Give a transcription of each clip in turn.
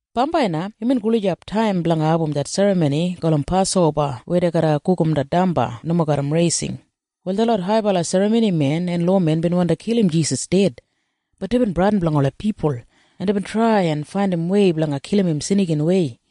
Bambai na imbin gulijap taim blanga abum det serramoni gulum Pasoba weya dei garra gugum det damba nomo garram raising. Wal detlot haibala serramonimen en lowamen bin wandi kilim Jisas ded. Bat deibin bradin blanga ola pipul, en deibin trai en faindimwei blanga kilim im snikinwei.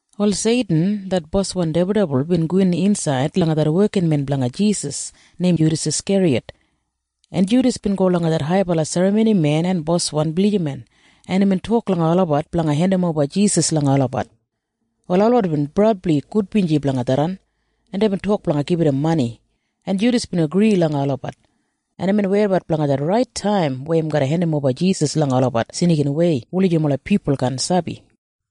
Wal Seitin det boswan dibuldibul bin gowin insaid langa det wekinmen blanga Jisas neim Judas Askeriyat, en Judas bin go langa detlot haibala serramonimen en boswan blijiman, en imbin tok langa olabat blanga hendimoba Jisas langa olabat. Wal olabat bin brabli gudbinji blanga tharran, en deibin tok blanga gibit im mani, en Judas bin agri langa olabat, en imbin weidabat blanga det rait taim weya im garra hendimoba Jisas langa olabat snikinwei wulijim ola pipul kaan sabi.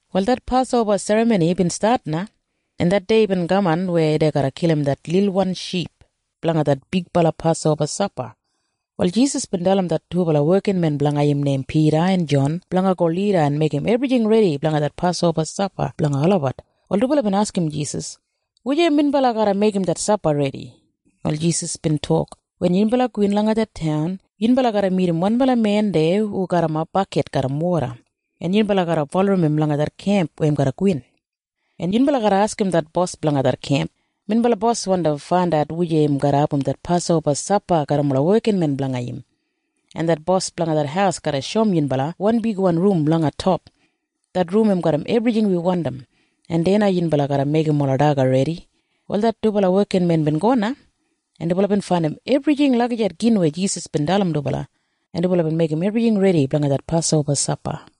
Wal det Pasoba Serramoni bin stat na, en det dei bin kaman weya dei garra kilim det lilwan ship blanga det bigbala Pasoba sapa. Wal Jisas bin dalim det dubala wekinmen blanga im neim Pida en Jon blanga go lida en meigim ebrijing redi blanga det Pasoba sapa blanga olabat. Wal dubala bin askim Jisas, “Wujei minbala garra meigim det sapa redi?” Wal Jisas bin tok, “Wen yunbala gowin langa det taun, yunbala garra midim wanbala men deya hu garrimap bakit garram woda, en yunbala garra bulurrum im langa det kemp weya im garra gowin, en yunbala garra askim det bos blanga det kemp, ‘Minbala bos wandi faindat wujei im garra abum det Pasoba sapa garram ola wekinmen blanga im.’ En det bos blanga det haus garra shoum yunbala wan bigwan rum langa top. Det rum im garram ebrijing wi wandim, en deya na yunbala garra meigim ola daga redi.” Wal det dubala wekinmen bin go na, en dubala bin faindim ebrijing lagijat gin weya Jisas bin dalim dubala, en dubala bin meigim ebrijing redi blanga det Pasoba sapa.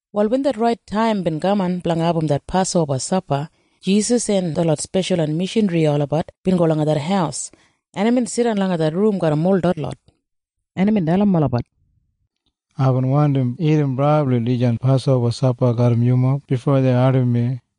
Wal wen det rait taim bin kaman blanga abum det Pasoba sapa, Jisas en detlot speshalwan mishanri olabat bin go langa det haus, en imbin jidan langa det rum garram ol detlot, en imbin dalim olabat, “Aibin wandi dagat brabli dijan Pasoba sapa garram yumob bifo dei ardim mi.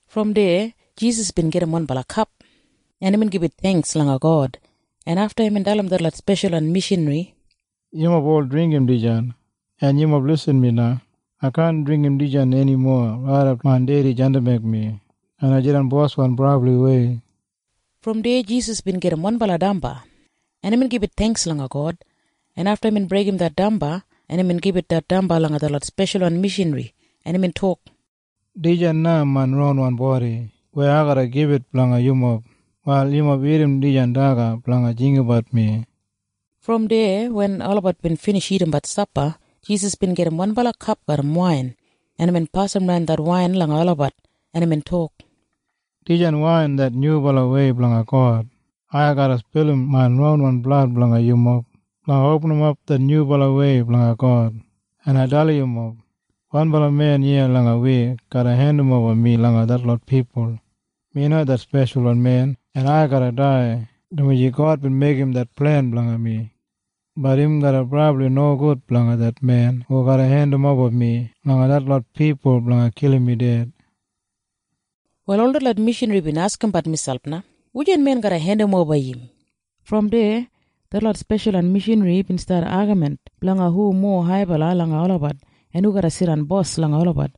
Brom deya Jisas bin gajim wanbala kap, en imbin gibit theingks langa God, en afta imbin dalim detlot speshalwan mishanri, “Yumob ol dringgim dijan. En yumob irrim mi na. Ai kaan dringgim dijan enimo raidap main Dedi jandimbek mi en ai jidan boswan brabliwei.” Brom deya Jisas bin gajim wanbala damba, en imbin gibit theingks langa God, en afta imbin breigim det damba, en imbin gibit det damba langa detlot speshalwan mishanri, en imbin tok, “Dijan na main ronwan bodi weya ai garra gibit blanga yumob. Wal yumob dagat dijan daga blanga jinggabat mi.” Brom deya wen olabat bin binij dagadagat sapa, Jisas bin gajim wanbala kap garram wain, en imbin pasimran det wain langa olabat, en imbin tok, “Dijan wain det nyubalawei blanga God. Ai garra spilim main ronwan blad blanga yumob blanga opinimap det nyubalawei blanga God. “En ai dalim yumob. Wanbala men iya langa wi garra hendimoba mi langa detlot pipul. Mi na det Speshalwan Men, en ai garra dai, dumaji God bin meigim det plen blanga mi. Bat im garra brabli nogud blanga det men hu garra hendimoba mi langa detlot pipul blanga kilim mi ded.” Wal ol detlot mishanri bin askimbat miselp na, “Wujan men garra hendimoba im?” Brom deya detlot speshalwan mishanri bin stat agamin blanga hu mowa haibala langa olabat en hu garra jidan bos langa olabat.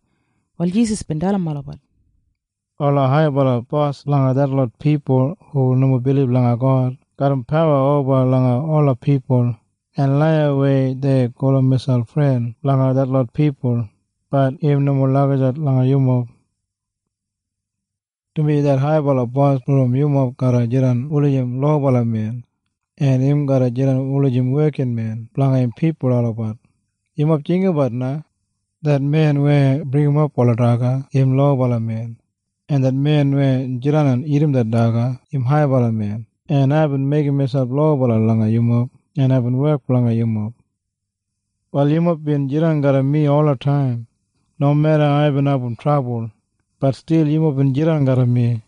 Wal Jisas bin dalim olabat, “Ola haibala bos blanga detlot pipul hu nomo bilib langa God garram pawa oba langa ola pipul, en laiyawei dei gulum miselp fren blanga detlot pipul. Bat im nomo lagijat langa yumob, dumaji det haibala bos brom yumob garra jidan wulijim lobala men, en im garra jidan wulijim wekinmen blanga im pipul olabat. “Yumob jinggabat na. Det men weya bringimap ola daga, im lobala men. En det men weya jidan en dagat det daga, im haibala men. En aibin meigim miselp lobala langa yumob, en aibin wek blanga yumob. “Wal yumob bin jidan garram mi olataim. Nomeda aibin abum trabul, bat stil yumob bin jidan garram mi.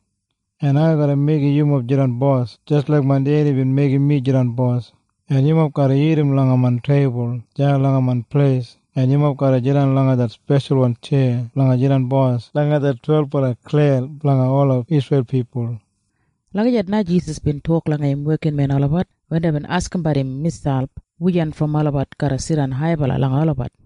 En ai garra meigim yumob jidan bos jis laik main Dedi bin meigim mi jidan bos. En yumob garra dagat langa main teibul deya langa main pleis, en yumob garra jidan langa detlot speshalwan tjeya blanga jidan bos langa det twelbala klen blanga ola Isreil pipul.” Lagijat na Jisas bin tok langa im wekinmen olabat wen deibin askimbat miselp wujan brom olabat garra jidan haibala langa olabat.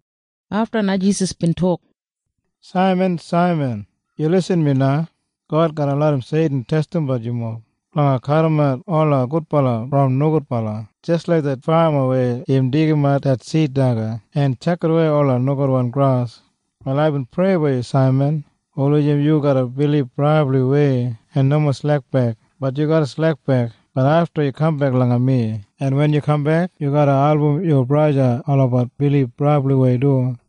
Afta na Jisas bin tok langa Saiman Pida, “Saiman, Saiman. Yu irrim mi na. God garra larram Seitin testimbat yumob blanga kadimat ola gudbala brom nogudbala jis laik det fama weya im deigimat det sid daga en tjakidawei ola nogudwan gras. “Wal aibin prei blanga yu, Saiman, wulijim yu garra bilib brabliwei en nomo slekbek. Bat ai sabi yu garra slekbek. Bat afta yu garra kambek langa mi. En wen yu kambek, yu garra album yu braja olabat bilib brabliwei du.”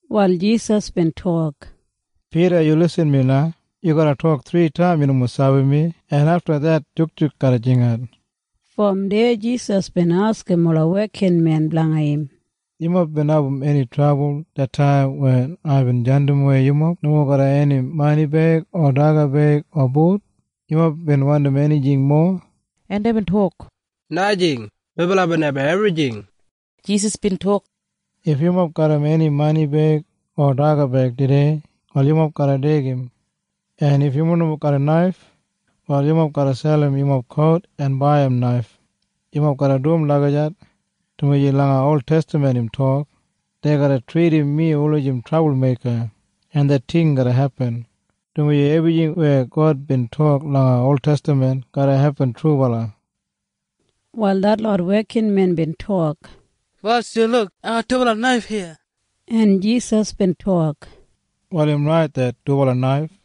Wal Jisas bin tok, “Pida, yu irrim mi na. Ai sabi yu garra tok thritaim yu nomo sabi mi, en afta det jukjuk garra jingat.” Brom deya Jisas bin askim ola wekinmen blanga im, “Yumob bin abum eni trabul det taim wen aibin jandimwei yumob nomo garram eni mani beig o daga beig o but? Yumob bin wandim enijing mowa?” En deibin tok, “Najing. Melabat bin abum ebrijing.” Wal Jisas bin tok, “If yumob garram mani beig o daga beig tudei, wal yumob garra deigim. En if yumob nomo garram naif, wal yumob garra selim yumob kout en baiyim naif. Yumob garra dum lagijat dumaji langa oltestaman im tok dei garra tridim mi wulijim trabulmeika. En det ting garra hepin, dumaji ebrijing weya God bin tok langa oltestaman garra hepin trubala.” Wal detlot wekinmen bin tok, “Bos, yu luk. Dubala bigwan naif iya.” En Jisas bin tok, “Wal im rait det dubala naif.”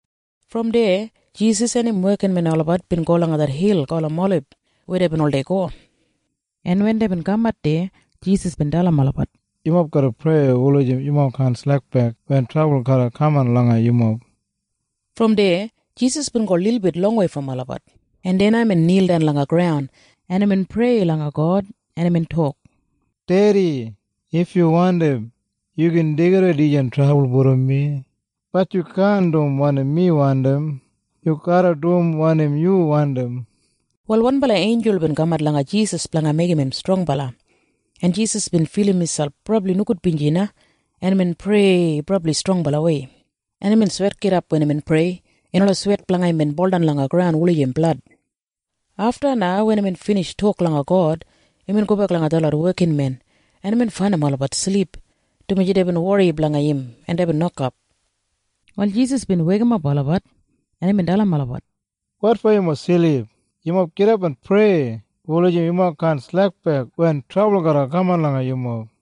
Brom deya Jisas en im wekinmen olabat bin go langa det hil gulum Olib weya deibin oldei go, en wen deibin kamat deya, Jisas bin dalim olabat, “Yumob garra prei wulijim yumob kaan slekbek wen trabul garra kaman langa yumob.” Brom deya Jisas bin go lilbit longwei brom olabat, en deya na imbin nildan langa graun, en imbin prei langa God. Imbin tok, “Dedi, if yu wandim, yu gin deigidawei dijan trabul brom mi. Bat yu kaan dum wanim mi wandim. Yu garra dum wanim yu wandim.” Wal wanbala einjul bin kamat langa Jisas blanga meigim im strongbala, en Jisas bin filim miselp brabli nogudbinji na, en imbin prei brabli strongbalawei, en imbin swetgidap wen imbin prei, en ola swet blanga im bin buldan langa graun wulijim blad. Afta na wen imbin binij tok langa God, imbin gobek langa detlot wekinmen, en imbin faindim olabat silip, dumaji deibin wori blanga im en deibin nokap. Wal Jisas bin weikimap olabat, en imbin dalim olabat, “Wotfo yumob silip? Yumob gidap en prei wulijim yumob kaan slekbek wen trabul garra kaman langa yumob.”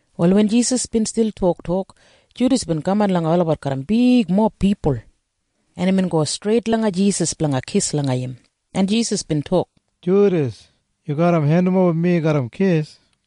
Wal wen Jisas bin stil toktok, Judas bin kaman langa olabat garram bigmob pipul, en imbin go streit langa Jisas blanga kis langa im, en Jisas bin tok, “Judas, yu garra hendimoba mi garram kis?”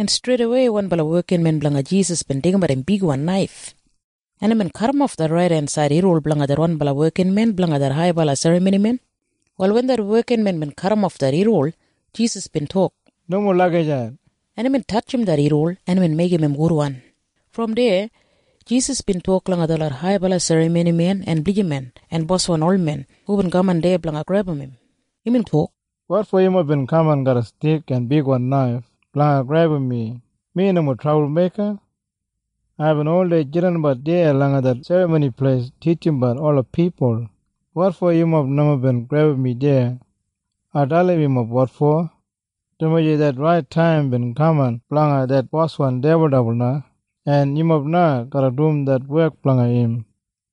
En streidawei wanbala wekinmen blanga Jisas bin deigimat im bigwan naif, en imbin kadimof det raidensaid irriwol blanga wanbala wekinmen blanga det haibala serramonimen. Wal wen det wekinmen bin kadimof det irriwol, Jisas bin tok, “Nomo lagijat!” En imbin tatjim det irriwol, en imbin meigim im gudwan. Brom deya Jisas bin tok langa detlot haibala serramonimen en blijiman en boswan olmen hubin kaman deya blanga grebum im. Imbin tok, “Wotfo yumob bin kaman garram stik en bigwan naif blanga grebum mi? Mi nomo trabulmeika. Aibin oldei jidanbat deya langa det Serramoni Pleis titjimbat ola pipul. Wotfo yumob nomo bin grebum mi deya? Ai dalim yumob wotfo. Dumaji det rait taim bin kaman blanga det boswan dibuldibul na, en yumob na garra dum det wek blanga im.”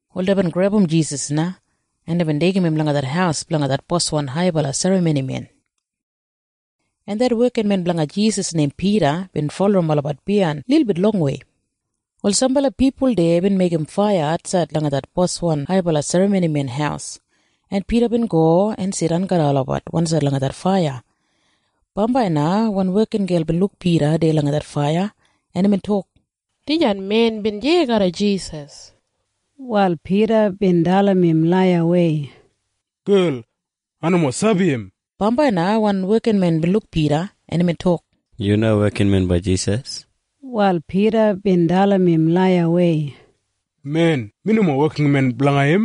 Wal deibin grebum Jisas na, en deibin deigim im langa det haus blanga det boswan haibala serramonimen, en det wekinmen blanga Jisas neim Pida bin bulurrum olabat biyain lilbit longwei. Wal sambala pipul deya bin meigim faiya atsaid langa det boswan haibala serramonimen haus, en Pida bin go en jidan garram olabat wansaid langa det faiya. Bambai na wan wekingel bin luk Pida deya langa det faiya, en imbin tok, “Dijan men bin deya garram Jisas.” Wal Pida bin dalim im laiyawei, “Gel, ai nomo sabi im!” Bambai na wan wekinmen bin luk Pida, en imbin tok, “Yu na wekinmen blanga Jisas.” Wal Pida bin dalim im laiyawei, “Men, mi nomo wekinmen blanga im!”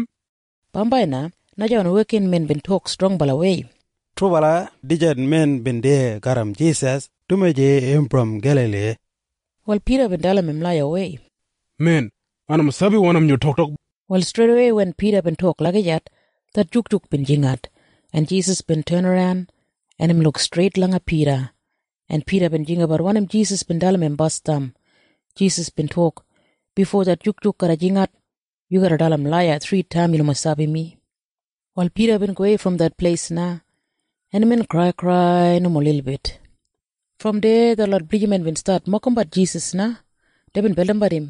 Bambai na najawan wekinmen bin tok strongbalawei, “Trubala dijan men bin deya garram Jisas, dumaji im brom Gelali!” Wal Pida bin dalim im laiyawei, “Men, ai nomo sabi wanim yu toktok!” Wal streidawei wen Pida bin tok lagijat, det jukjuk bin jingat, en Jisas bin tenaran, en imbin luk streit langa Pida, en Pida bin jinggabat wanim Jisas bin dalim im basdam. Jisas bin tok, “Bifo det jukjuk garra jingat, yu garra dalim laiya thritaim yu nomo sabi mi.” Wal Pida bin gowei brom det pleis na, en imbin kraikrai nomo lilbit. Brom deya detlot blijiman bin stat mokimbat Jisas na. Deibin beldimbat im,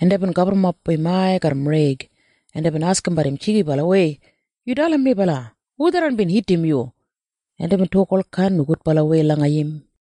en deibin gaburrumap im ai garram reig, en deibin askimbat im jigibalawei, “Yu dalim melabat! Hu tharran bin hitim yu?” En deibin tok olkain nogudbalawei langa im.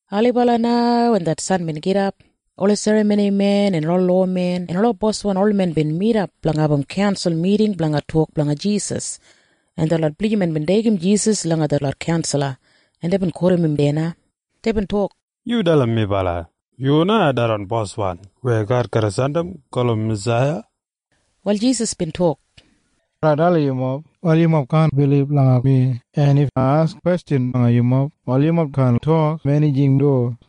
Ailibala na wen det san bin gidap, ola serramonimen en ola lowamen en ola boswan olmen bin midap blanga abum kaunsal miting blanga tok blanga Jisas, en detlot blijiman bin deigim Jisas langa detlot kaunsala, en deibin kotim im deya na. Deibin tok, “Yu dalim melabat! Yu na tharran Boswan weya God garra jandim gulum Masaiya?” Wal Jisas bin tok, “If ai dalim yumob, wal yumob kaan bilib langa mi. En if ai askim kwestjan langa yumob, wal yumob kaan ensim mi du.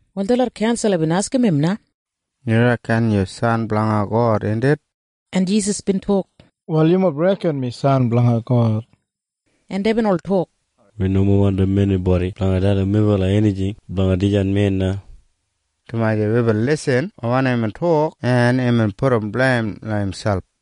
Wal detlot kaunsala bin askim im na, “Yu reken yu San blanga God, indit?” En Jisas bin tok, “Wal yumob reken mi San blanga God.” En deibin ol tok, “Wi nomo wandim enibodi blanga dalim melabat enijing blanga dijan men na, dumaji wibin irrim wanim imbin tok en imbin pudum bleim imselp!”